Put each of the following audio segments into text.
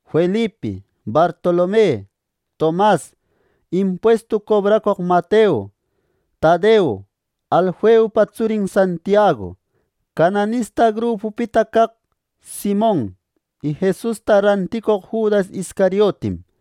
Felipi, Bartolome, Tomas, impuestu cobracoq Mateo, Tadeo, Alfeupa tsurin Santiagu, “Cananista grupupita caq” Simon y Jesusta ranticoq Judas Iscariotim.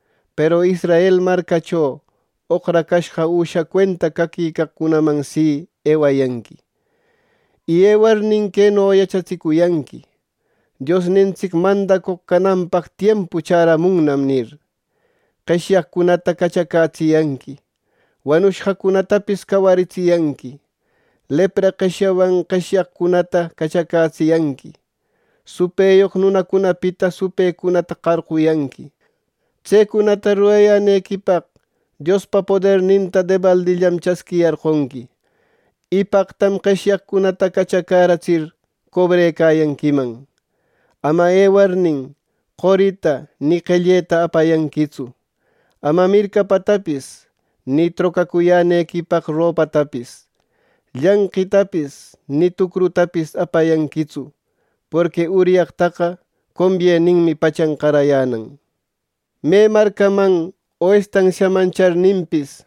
peru Israel marcacho oqracashqa üsha cuenta caquicaqcunaman si, ewayanqui. Y ewarnin queno yachatsicuyanqui: ‘Diosnintsic mandacoq cananpaq tiempu chäramunnam’ nir. Qeshyacoqcunata cachacätsiyanqui; wanushqacunatapis cawaritsiyanqui; lepra qeshyawan qeshyaqcunata cachacätsiyanqui; supëyoq nunacunapita supëcunata qarquyanqui. Tsecunata rurayänequipaq Diospa poderninta debaldillam chasquiyarqonqui, y paqtam qeshyaqcunata cachacäratsir cobrecayanquiman. “Ama ewarnin qorita ni qelleta apayanquitsu. Ama mircapatapis, ni trocacuyänequipaq ropatapis, llanqitapis ni tucrutapis apayanquitsu; porqui uryaqtaqa combieninmi pachan qarayänan. “Me marcaman o estansiaman charninpis,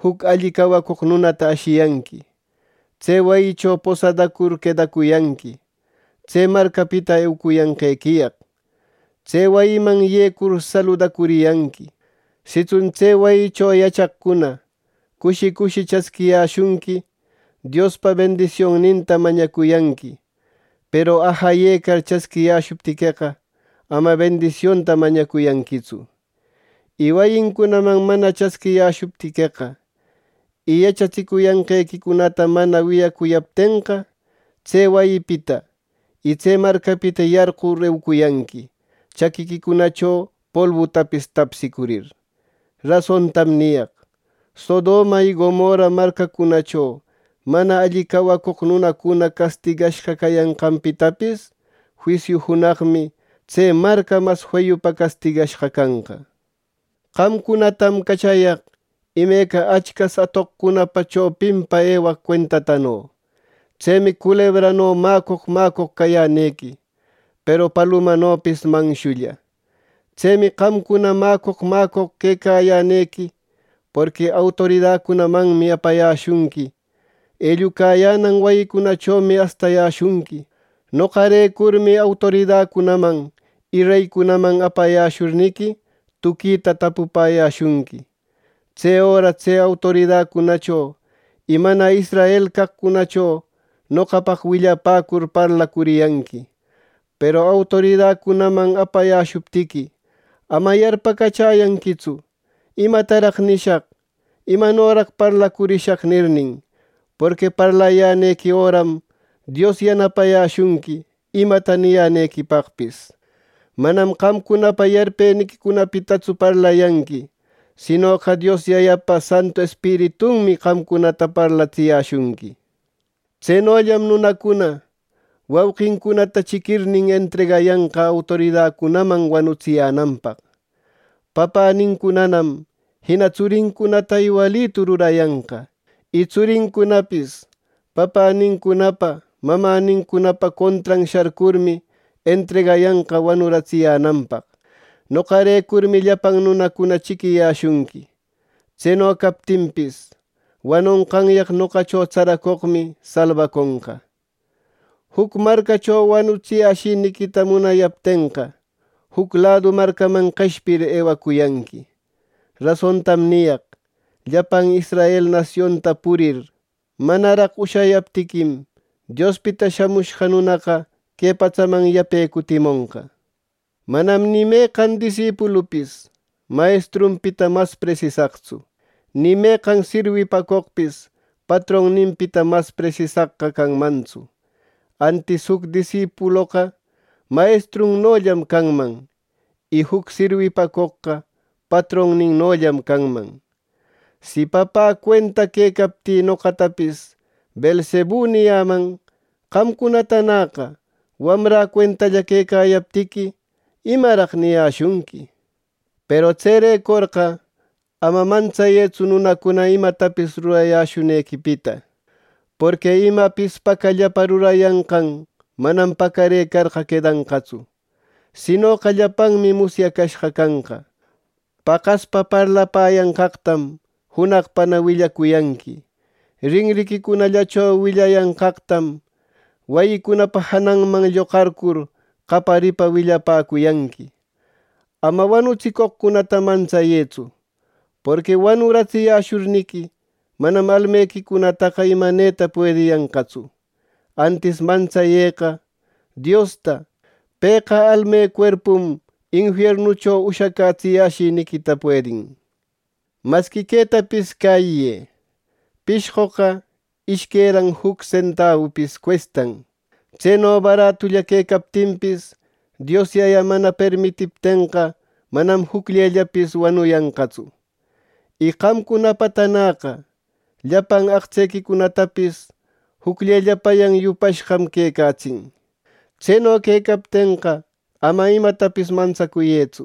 juc alli cawacoq nunata ashiyanqui. Tse wayincho posadacur quedacuyanqui, tse marcapita eucuyanqequiyaq. Tse wayiman yecur saludacuriyanqui. Sitsun tse wayicho yachaqcuna cushi cushi chasquiyäshunqui, Diospa bendisionninta mañacuyanqui; peru ajayecar chasquiyäshuptiqueqa, ama bendisionta mañacuyanquitsu. Y wayincunaman mana chasquiyäshuptiqueqa, y yachatsicuyanqequicunata mana wiyayäshuptiqueqa, tse wayipita y tse marcapita yarqur eucuyanqui chaquiquicunacho polbutapis tapsicurir. Rasontam niyaq: Sodoma y Gomorra marcacunacho mana alli cawacoq nunacuna castigashqa cayanqanpitapis, juisiu junaqmi tse marca mas feyupa castigashqa canqa. “Qamcunatam cachayaq imeca achcas atoqcunapa chopinpa ewaq cuentatano. Tsemi culebrano mäcoq, mäcoq cayänequi, peru palumanopis manshulla. Tsemi qamcuna mäcoq mäcoq quecayänequi; porqui autoridacunamanmi apayäshunqui. Ellucayänan wayicunachomi astayäshunqui. Noqarecurmi autoridacunaman y reycunaman apayäshurniqui, tuquita tapupäyäshunqui. Tse öra tse autoridacunacho y mana israel caqcunacho noqapaq willapäcur parlacuriyanqui. Peru autoridacunaman apayäshuptiqui, ama yarpacachäyanquitsu, ‘¿Imataraq nishaq? ¿Imanoraq parlacurishaq?’ nirnin; porqui parlayänequi öram Dios yanapayäshunqui imata niyänequipaqpis. Manam qamcunapa yarpeniquicunapitatsu parlayanqui, sinoqa Dios Yayapa Santu Espiritunmi qamcunata parlatsiyäshunqui. “Tsenollam nunacuna wauqincunata chiquirnin, entregayanqa autoridacunaman wanutsiyänanpaq. Papänincunanam jina tsurincunata iwalitu rurayanqa. Y tsurincunapis papänincunapa mamänincunapa contran sharcurmi, entregayanqa wanuratsiyänanpaq. Noqarecurmi llapan nunacuna chiquiyäshunqui. Tseno captinpis, wanonqanyaq noqacho tsaracoqmi salbaconqa. Juc marcacho wanutsiyäshiniquita munayaptenqa, juc ladu marcaman qeshpir ewacuyanqui. Rasontam niyaq, llapan Israel nasionta purir, manaraq ushayaptiquim, Diospita Shamushqa Nunaqa que patsaman yape cutimonqa. “Manam ni meqan disipulupis mayestrunpita mas presisaqtsu, ni meqan sirwipacoqpis patronninpita mas presisaqqa canmantsu. Antis juc disipuloqa mayestrunnollam canman, y juc sirwipacoqqa patronninnollam canman. Si papä cuenta quecaptï noqatapis ‘Beelzebu’ niyaman, qamcunatanäqa wamrä cuentalla quecayaptiqui, ¿imaraq niyäshunqui! “Peru tserecorqa ama mantsayëtsu nunacuna imatapis rurayäshunequipita. Porqui imapis pacallapa rurayanqan manam pacarëcarqa quedanqatsu; sinoqa llapanmi musyacashqa canqa. Paqaspa parlapäyanqaqtam junaqpana willacuyanqui. Rinriquicunallacho willayanqaqtam, wayicunapa jananman lloqarcur qayaripa willapäcuyanqui. Ama wanutsicoqcunata mantsayëtsu. Porqui wanuratsiyäshurniqui, manam almequicunataqa imaneta puediyanqatsu. Antis mantsayëqa Diosta. Pëqa almecuerpum infiernucho ushacätsiyäshiniquita puedin. “Masqui quetapis cäyiyë: Pishqoqa ishqueran juc sentabupis cuestan. Tseno baratulla quecaptinpis, Dios Yaya mana permitiptenqa manam jucllellapis wanuyanqatsu. Y qamcunapatanäqa llapan aqtsequicunatapis jucllellapayan yupashqam quecatsin. Tseno quecaptenqa, ama imatapis mantsacuyëtsu.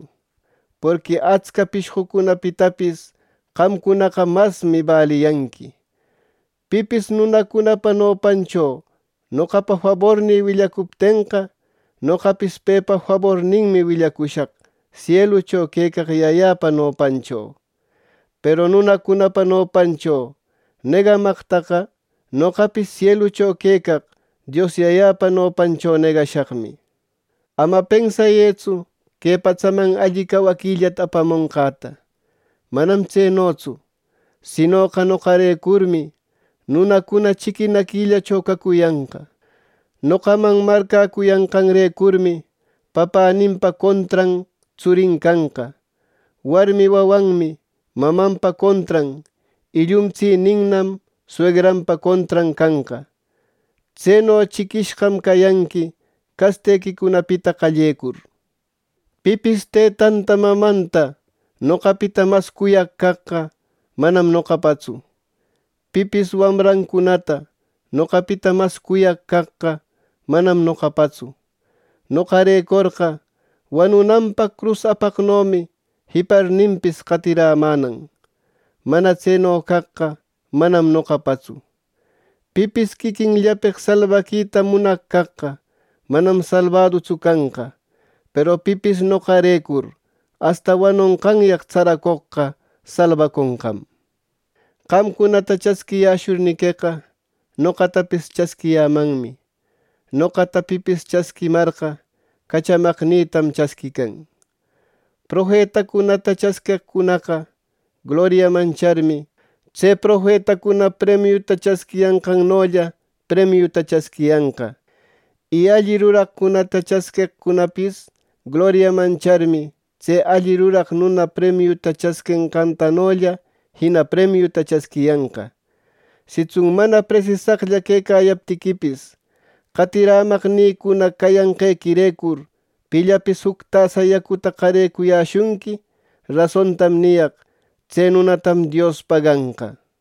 Porqui atsca pishqocunapitapis qamcunaqa masmi baliyanqui. “Pipis nunacunapa nopancho noqapa fabornï willacuptenqa, noqapis pepa faborninmi willacushaq sielucho quecaq Yayäpa nopancho. Peru nunacunapa nopancho negamaqtaqa, noqapis sielucho quecaq Dios Yayäpa nopancho negashaqmi. “Ama pensayëtsu que patsaman alli cawaquillata apamonqäta. Manam tsenotsu; sinoqa noqarecurmi nunacuna chiquinaquillacho cacuyanqa. Noqaman marcäcuyanqanrecurmi papäninpa contran tsurin canqa, warmi wawanmi mamanpa contran y llumtsininnam suegranpa contran canqa. Tseno chiquishqam cayanqui castequicunapita qallecur. “Pipis tëtanta mamanta noqapita mas cuyaq caqqa, manam noqapatsu; pipis wamrancunata noqapita mas cuyaq caqqa, manam noqapatsu. Noqarecorqa, wanunanpaq crus apaqnomi jiparninpis, qatirämänan. Mana tseno caqqa, manam noqapatsu. Pipis quiquinllapeq salbaquita munaq caqqa manam salbadutsu canqa; peru pipis noqarecur asta wanonqanyaq tsaracoqqa salbaconqam. “Qamcunata chasquiyäshurniqueqa, noqatapis chasquiyämanmi; noqata pipis chasquimarqa, cachamaqnïtam chasquican. Profetacunata chasqueqcunaqa gloriaman charmi, tse profetacuna premiuta chasquiyanqantanolla premiuta chasquiyanqa. Y alli ruraqcunata chasqueqcunapis gloriaman charmi, tse alli ruraq nuna premiuta chasquenqantanolla jina premiuta chasquiyanqa. Sitsun mana presisaqlla quecayaptiquipis, qatirämaqnïcuna cayanqequirecur pillapis juc tasa yacuta qarecuyäshunqui; rasontam niyaq: tse nunatam Dios paganqa.”